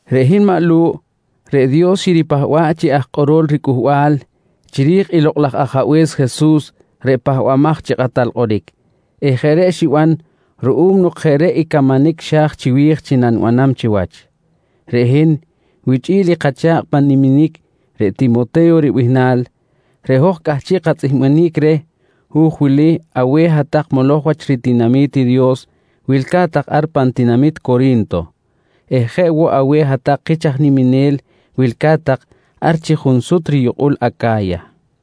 Reꞌ hin maꞌ Lu̱ꞌ, reꞌ Dios xiripahba̱ꞌ chi aj kꞌorol riCꞌuhbal chiri̱j i Lokꞌ laj Ajabe̱s Jesus reꞌ Pahbamaj chi Kꞌatal Kꞌoric eh jeꞌ reꞌ xiban ruꞌum nok jeꞌ reꞌ i camanic xa̱j chiwi̱j chi nanibanam chiwach. Reꞌ hin wichꞌi̱l i kacha̱kꞌ pan niminic reꞌ Timote̱yo ribihnal, reꞌ hoj cꞌahchiꞌ katzꞌihbanic reh hu̱j wili aweh hat-tak moloj wach ritinami̱t i Dios wilca̱t tak ar pan tinamit Cori̱nto eh jeꞌ woꞌ aweh hat-tak kich aj niminel wilca̱t tak ar chi junsut riyukꞌul i Aca̱ya.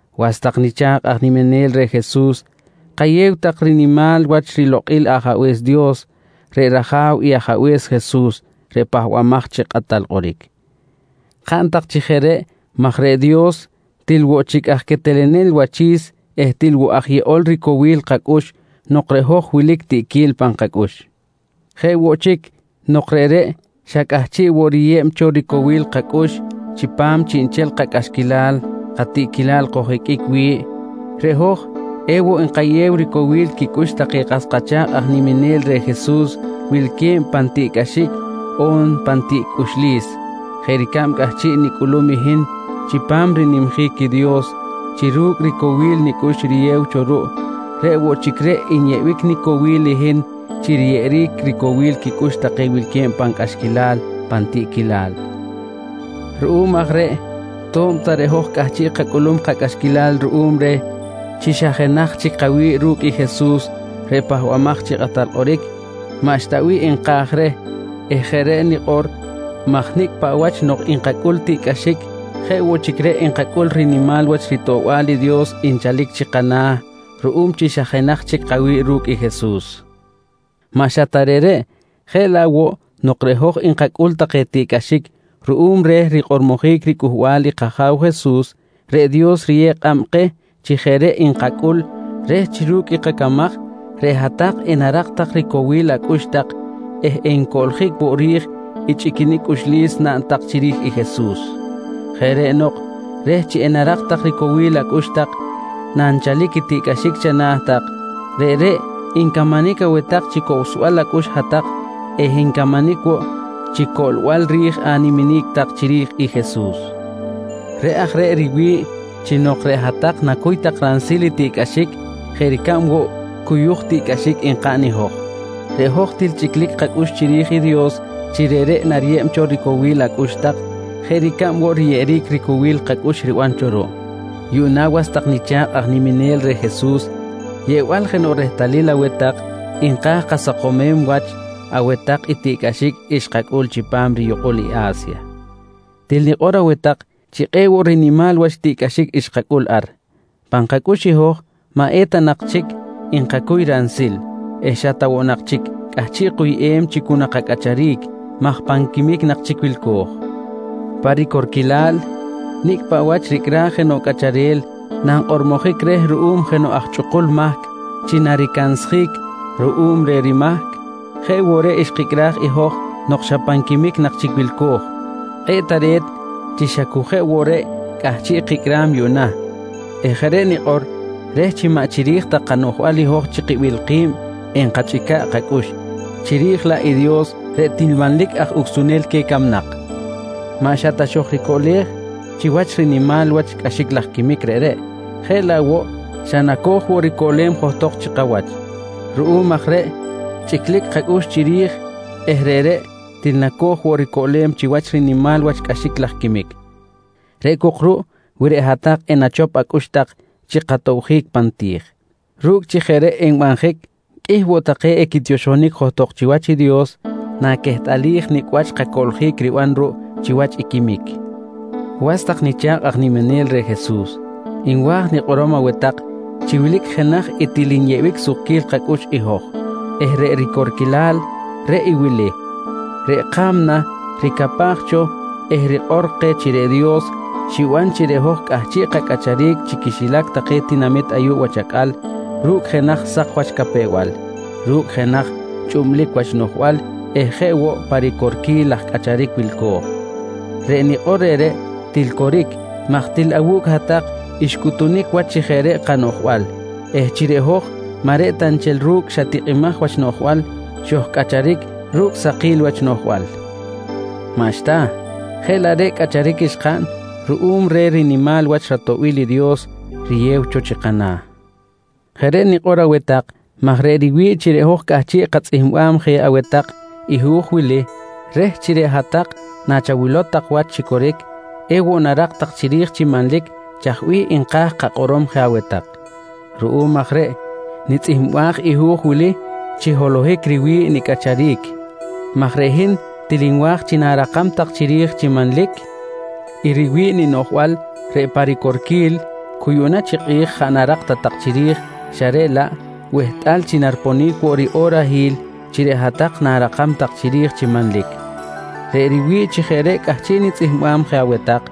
Was tak nicha̱kꞌ aj niminel reh Jesus, kayew tak rinimal wach rilokꞌil i Ajabe̱s Dios reꞌ rAja̱w i Ajabe̱s Jesus reꞌ Pahbamaj chi Kꞌatal Kꞌoric. Kaꞌn tak chi jeꞌ reꞌ maj reꞌ Dios, til woꞌ chic aj quetelenel wachi̱s eh til woꞌ aj yeꞌol ricowil kacꞌux nok reꞌ hoj wilic tiꞌquil pan kacꞌux. Jeꞌ woꞌ chic nok reꞌreꞌ xa cꞌahchiꞌ woꞌ riyeb cho ricowil kacꞌux chipam chiꞌnchel kacꞌaxquilal katiꞌquilal koj-iqꞌuic wi̱ꞌ, reꞌ hoj ewoꞌ nkayew ricowil quicꞌux take kas kacha̱kꞌ aj niminel reh Jesus wilque̱b pan tiꞌcꞌaxic on pan tiꞌquil cꞌuxlis, jeꞌ ricab cꞌahchiꞌ nicꞌulum i hin chipam rinimjic i Dios chi ru̱cꞌ i ricowil nicꞌux riyew cho ruꞌ, reꞌ woꞌ chic reꞌ nyeꞌbic nicowil i hin chi riyeꞌeric ricowil quicꞌux take wilque̱b pan cꞌaxquilal pan tiꞌquilal. Ruꞌum aj reꞌ to̱b ta reꞌ hoj cꞌahchiꞌ kacꞌulum kacꞌaxquilal ruꞌum reh chi xa jenaj chic kawi̱ꞌ ru̱cꞌ i Jesus reꞌ Pahbamaj chi Kꞌatal Kꞌoric, maꞌxta bih nka̱j reh eh jeꞌ reꞌ nikꞌor maj nicꞌ paꞌ wach nok nkacꞌul tiꞌcꞌaxic jeꞌ woꞌ chic reꞌ nkacꞌul rinimal wach ritoꞌbal i Dios nchalic chi kana̱ ruꞌum chi xa jenaj chic kawi̱ꞌ ru̱cꞌ i Jesus. Maꞌ xa ta reꞌreꞌ, jeꞌ laꞌ woꞌ nok reꞌ hoj nkacꞌul take tiꞌcꞌaxic ruꞌum reh rikꞌormojic riCꞌuhbal i kAja̱w Jesus, reꞌ Dios riyew kꞌab keh chi jeꞌ reꞌ nkacꞌul reh chi ru̱cꞌ i kacamaj reꞌ hat-tak enarak tak ricowil acꞌux tak eh encoꞌljic woꞌ ri̱j i chꞌiquinic cꞌuxlis naꞌn tak chiri̱j i Jesus. Jeꞌ reꞌ nok reh chi enarak tak ricowil acꞌux tak nanchal i tiꞌcꞌaxic chana̱ tak, reꞌreꞌ ncamanic aweh tak chi cowsbal acꞌux hat-tak eh ncamanic woꞌ chi coꞌlbal ri̱j animinic tak chiri̱j i Jesus. Reꞌ aj reꞌ riwi̱ꞌ chi nok reꞌ hat-tak nacuy tak ransil i tiꞌcꞌaxic jeꞌ ricab woꞌ cuyuj tiꞌcꞌaxic nkaꞌn i hoj, reꞌ hoj til chꞌiclic kacꞌux chiri̱j i Dios chi reꞌreꞌ nariyeb cho ricowil acꞌux tak jeꞌ ricab woꞌ riyeꞌeric ricowil kacꞌux riban cho ruꞌ. Yuꞌna was tak nicha̱kꞌ aj niminel reh Jesus, yeꞌbal jenoꞌ rehtalil aweh tak nka̱j kasakomem wach aweh tak i tiꞌcꞌaxic xkacꞌul chipam riyukꞌul i A̱sya. Til nikꞌor aweh tak chi kꞌe̱ꞌ woꞌ rinimal wach tiꞌcꞌaxic xkacꞌul ar. Pan kacꞌux i hoj maꞌ eta ta nak chic nkacuy ransil eh xa ta woꞌ nak chic cꞌahchiꞌ kuyꞌem chi cu nakacꞌacharic maj pan quimic nak chic wilco̱j. Pa ricorquilal, nicꞌ paꞌ wach ricꞌraj jenoꞌ cꞌacharel nankꞌormojic reh ruꞌum jenoꞌ aj chꞌukul mahc chi naricansjic ruꞌum reh rimahc jeꞌ woꞌ reꞌ xkicꞌraj i hoj nok xa pan quimic nak chic wilco̱j. Kꞌe̱ꞌ tare̱t chi xa cu jeꞌ woꞌ reꞌ cꞌahchiꞌ kicꞌram yuꞌna eh jeꞌ reꞌ nikꞌor reh chi maꞌ chiri̱j ta kanoꞌjbal i hoj chi kibil ki̱b enkachꞌica̱ꞌ kacꞌux, chiri̱j laꞌ i Dios reꞌ til manlic aj ucsunel queh camnak. Maꞌ xa ta xojricoꞌlej chiwach rinimal wach cꞌaxic laj quimic reꞌreꞌ jeꞌ laꞌ woꞌ xa nacoj woꞌ ricoꞌlem johtok chi kawach. Ruꞌum aj reꞌ chꞌiclic kacꞌux chiri̱j eh reꞌreꞌ til nacoj woꞌ ricoꞌlem chiwach rinimal wach cꞌaxic laj quimic reꞌ cok ruꞌ wi reꞌ hat-tak enachop acꞌux tak chi katobjic pan ti̱j. Ru̱cꞌ chi jeꞌ reꞌ enbanjic qꞌuih woꞌ take equitioxonic johtok chiwach i Dios naquehtꞌalij nicꞌ wach kacoꞌljic riban ruꞌ chiwach i quimic. Was tak nicha̱kꞌ aj niminel reh Jesus, nwa̱j nikꞌorom aweh tak chi wilic jenaj i til nyeꞌbic sukquil kacꞌux i hoj eh reꞌ ricorquilal, reꞌ i wili: Reꞌ ka̱mna ricapaj cho eh rikꞌor keh chi reꞌ Dios xiban chi reꞌ hoj cꞌahchiꞌ kacꞌacharic chi quixilac take tinamit ayuꞌ wach acꞌal ru̱cꞌ jenaj sak wach capew-bal, ru̱cꞌ jenaj chꞌublic wach noꞌjbal eh jeꞌ woꞌ pa ricorquil laj cꞌacharic wilco̱j. Reꞌ nikꞌor reꞌreꞌ til coric maj til awu̱cꞌ hat-tak xcꞌutunic wach chi jeꞌ reꞌ kanoꞌjbal eh chi reꞌ hoj maꞌ reꞌ ta nchel ru̱cꞌ xa tikꞌimaj wach noꞌjbal xojcꞌacharic ru̱cꞌ sakil wach noꞌjbal. Maꞌxta! Jeꞌ laꞌ reꞌ cꞌacharic xkaꞌn ruꞌum reh rinimal wach ratoꞌbil i Dios riyew cho chi kana̱. Jeꞌ reꞌ nikꞌor aweh tak maj reꞌ riwi̱ꞌ chi reꞌ hoj cꞌahchiꞌ katzꞌihmbam je aweh tak i hu̱j wili reh chi reꞌ hat-tak nachawilow tak wach chi coric, ewoꞌ narak tak chiri̱j chi manlic chaj bih nka̱j kakꞌorom je aweh tak. Ruꞌum aj reꞌ nitzꞌihmbaj i hu̱j wili chi holohic riwi̱ꞌ nicꞌacharic maj reꞌ hin til nwa̱j chi na̱rakam tak chiri̱j chi manlic i riwi̱ꞌ i ninoꞌjbal reꞌ pa ricorquil, cu yuꞌna chi kꞌi̱j jaꞌ narak ta tak chiri̱j xa reꞌ laꞌ wehtꞌal chi nariponic woꞌ riꞌorahil chi reꞌ hat-tak na̱rakam tak chiri̱j chi manlic. Reꞌ riwi̱ꞌ chi jeꞌ reꞌ cꞌahchiꞌ nitzꞌihmbam je aweh tak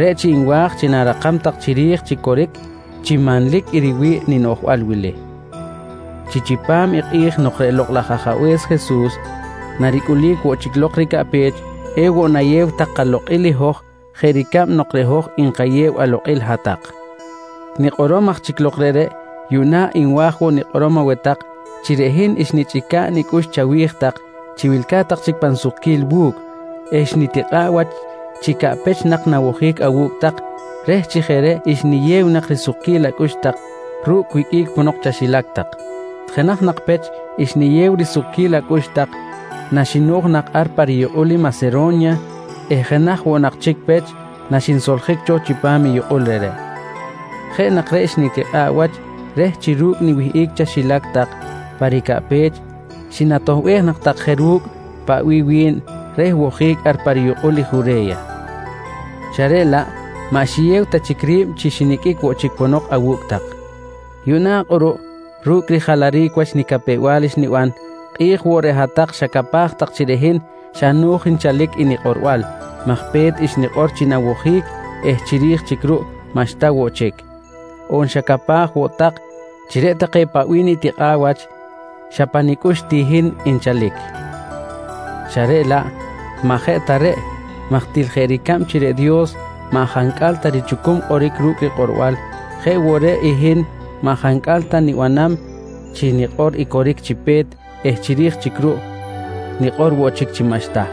re̱ chi nwa̱j chi na̱rakam tak chiri̱j chi coric chi manlic i riwi̱ꞌ i ninoꞌjbal wili: Chi chipam i kꞌi̱j nok reꞌ Lokꞌ laj Ajabe̱s Jesus naricꞌulic woꞌ chic lok ricaꞌpech, ewoꞌ nayew tak kalokꞌil i hoj jeꞌ ricab nok reꞌ hoj nkayew alokꞌil hat-tak. Nikꞌorom aj chic lok reꞌreꞌ, yuꞌna nwa̱j woꞌ nikꞌorom aweh tak chi reꞌ hin xnichꞌica̱ꞌ nicꞌux chawi̱j tak chi wilca̱t tak chic pan sukquil wu̱cꞌ eh xnitikꞌa̱ꞌ wach chi caꞌpech nak nawojic awu̱cꞌ tak reh chi jeꞌ reꞌ xniyew nak risukquil acꞌux tak ru̱cꞌ wiqꞌuic ponok chaxilac tak. Jenaj nak pech xniyew risukquil acꞌux tak naxino̱j nak ar pa riyukꞌul i Masero̱nya eh jenaj woꞌ nak chic pech naxinsoljic cho chipam yukꞌul reꞌreꞌ. Jeꞌ nak reꞌ xnitikꞌa̱ꞌ wach reh chi ru̱cꞌ niwihꞌic chaxilac tak pa ricaꞌpech xinatoꞌbej nak tak je ru̱cꞌ paꞌ bih wi̱n reh wojic ar pa riyukꞌul i Jure̱ya xa reꞌ laꞌ maꞌ xiyew ta chic ri̱b chi xiniqꞌuic woꞌ chic ponok awu̱cꞌ tak. Yuꞌna kꞌuruꞌ ru̱cꞌ rijalaric wach nicapew-bal xniban, kꞌi̱j woꞌ reꞌ hat-tak xacapaj tak chi reꞌ hin xa no̱j nchalic i nikꞌorbal maj pe̱t xnikꞌor chi nawojic eh chiri̱j chic ruꞌ maꞌxta woꞌ chic. On xacapaj woꞌ tak chi reꞌ take paꞌ bih take nitikꞌa̱ꞌ wach xa pa nicꞌux ti hin nchalic xa reꞌ laꞌ maꞌ jeꞌ ta reꞌ maj til jeꞌ ricab chi reꞌ Dios maꞌ jancꞌal ta richucum kꞌoric ru̱cꞌ rikꞌorbal jeꞌ woꞌ reꞌ i hin maꞌ jancꞌal ta nibanam chi nikꞌor i coric chi pe̱t eh chiri̱j chic ruꞌ nikꞌor woꞌ chic chi maꞌxta.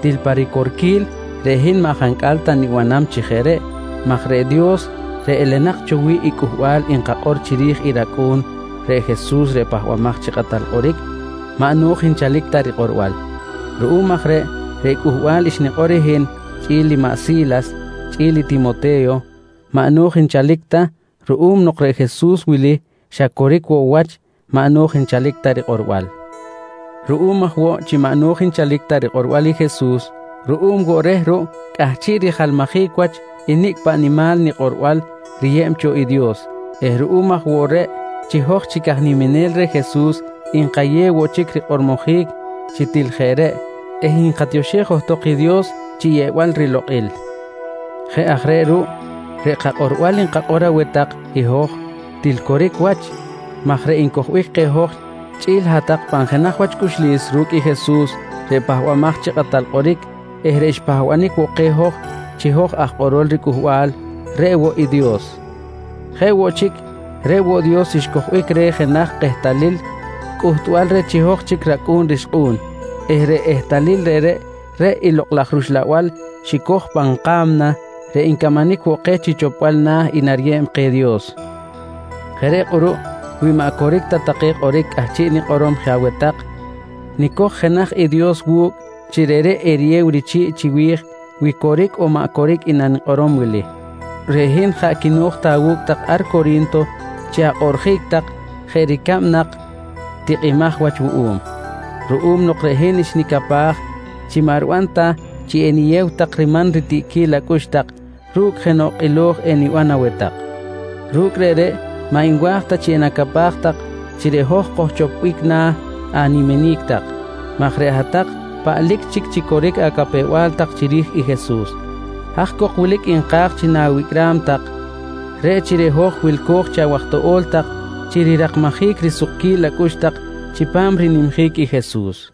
Til pa ricorquil reꞌ hin maꞌ jancꞌal ta nibanam chi jeꞌ reꞌ maj reꞌ Dios reꞌ elenak cho wi̱ꞌ i cꞌuhbal nkakꞌor chiri̱j i rAcꞌu̱n reꞌ Jesus reꞌ Pahbamaj chi Kꞌatal Kꞌoric, maꞌ no̱j nchalic ta rikꞌorbal. Ruꞌum aj reꞌ, reꞌ cꞌuhbal xnikꞌor i hin chꞌi̱l i maꞌ Si̱las chꞌi̱l i Timote̱yo maꞌ no̱j nchalic ta ruꞌum nok reꞌ Jesus wili xa coric woꞌ cho wach maꞌ no̱j nchalic ta rikꞌorbal. Ruꞌum aj woꞌ chi maꞌ no̱j nchalic ta rikꞌorbal i Jesus, ruꞌum woꞌ reꞌ ruꞌ cꞌahchiꞌ rimanlajic wach i nicꞌ paꞌ nimal rikꞌorbal riyeb cho i Dios eh ruꞌum aj woꞌ reꞌ chi hoj chic aj niminel reh Jesus, nkayew woꞌ chic rikꞌormojic chi til jeꞌ reꞌ eh nkatioxej johtok i Dios chi yeꞌbal rilokꞌil. Jeꞌ aj reꞌ ruꞌ reꞌ kakꞌorbal nkakꞌor aweh tak i hoj til coric wach maj reꞌ ncojbic keh hoj chꞌi̱l hat-tak pan jenaj wach cꞌuxlis ru̱cꞌ i Jesus reꞌ Pahbamaj chi Kꞌatal Kꞌoric eh reꞌ xpahbanic woꞌ keh chi hoj aj kꞌorol ricꞌuhbal, reꞌ woꞌ i Dios. Jeꞌ woꞌ chic, reꞌ woꞌ Dios xcojbic reh jenaj kehtalil cꞌuhtbal reh chi hoj chic racꞌu̱n rixkꞌu̱n eh reꞌ ehtalil reꞌreꞌ, reꞌ i Lokꞌ laj rUxlabal xicoj pan ka̱mna reꞌ ncamanic woꞌ keh chi chopbal na̱ i nariyeb keh i Dios. Jeꞌ reꞌ kꞌuruꞌ wi maꞌ coric take kꞌoric cꞌahchiꞌ nikꞌorom je aweh tak nicoj jenaj i Dios wu̱cꞌ chi reꞌreꞌ eriyew richi̱ꞌ chiwi̱j wi coric on maꞌ coric i nanikꞌorom wili: Reꞌ hin jaꞌ quino̱j ta awu̱cꞌ tak ar Cori̱nto chi akꞌoꞌrjic tak jeꞌ ricab nak tikꞌimaj wach wuꞌum, ruꞌum nok reꞌ hin xnicapaj chi maꞌ riban ta chi eniyew tak riman ritiꞌquil acꞌux tak ru̱cꞌ jenoꞌ kꞌilo̱j eniban aweh tak. Ru̱cꞌ reꞌreꞌ maꞌ nwa̱j ta chi enacapaj tak chi reꞌ hoj kojchopbic na̱ animinic tak maj reꞌ hat-tak paꞌlic chic chi coric acapew-bal tak chiri̱j i Jesus. Haj cok wilic nka̱j chi nawicꞌram tak, reꞌ chi reꞌ hoj wilco̱j chi awaj toꞌo̱l tak chi rirakmajic risukquil acꞌux tak chipam rinimjic i Jesus.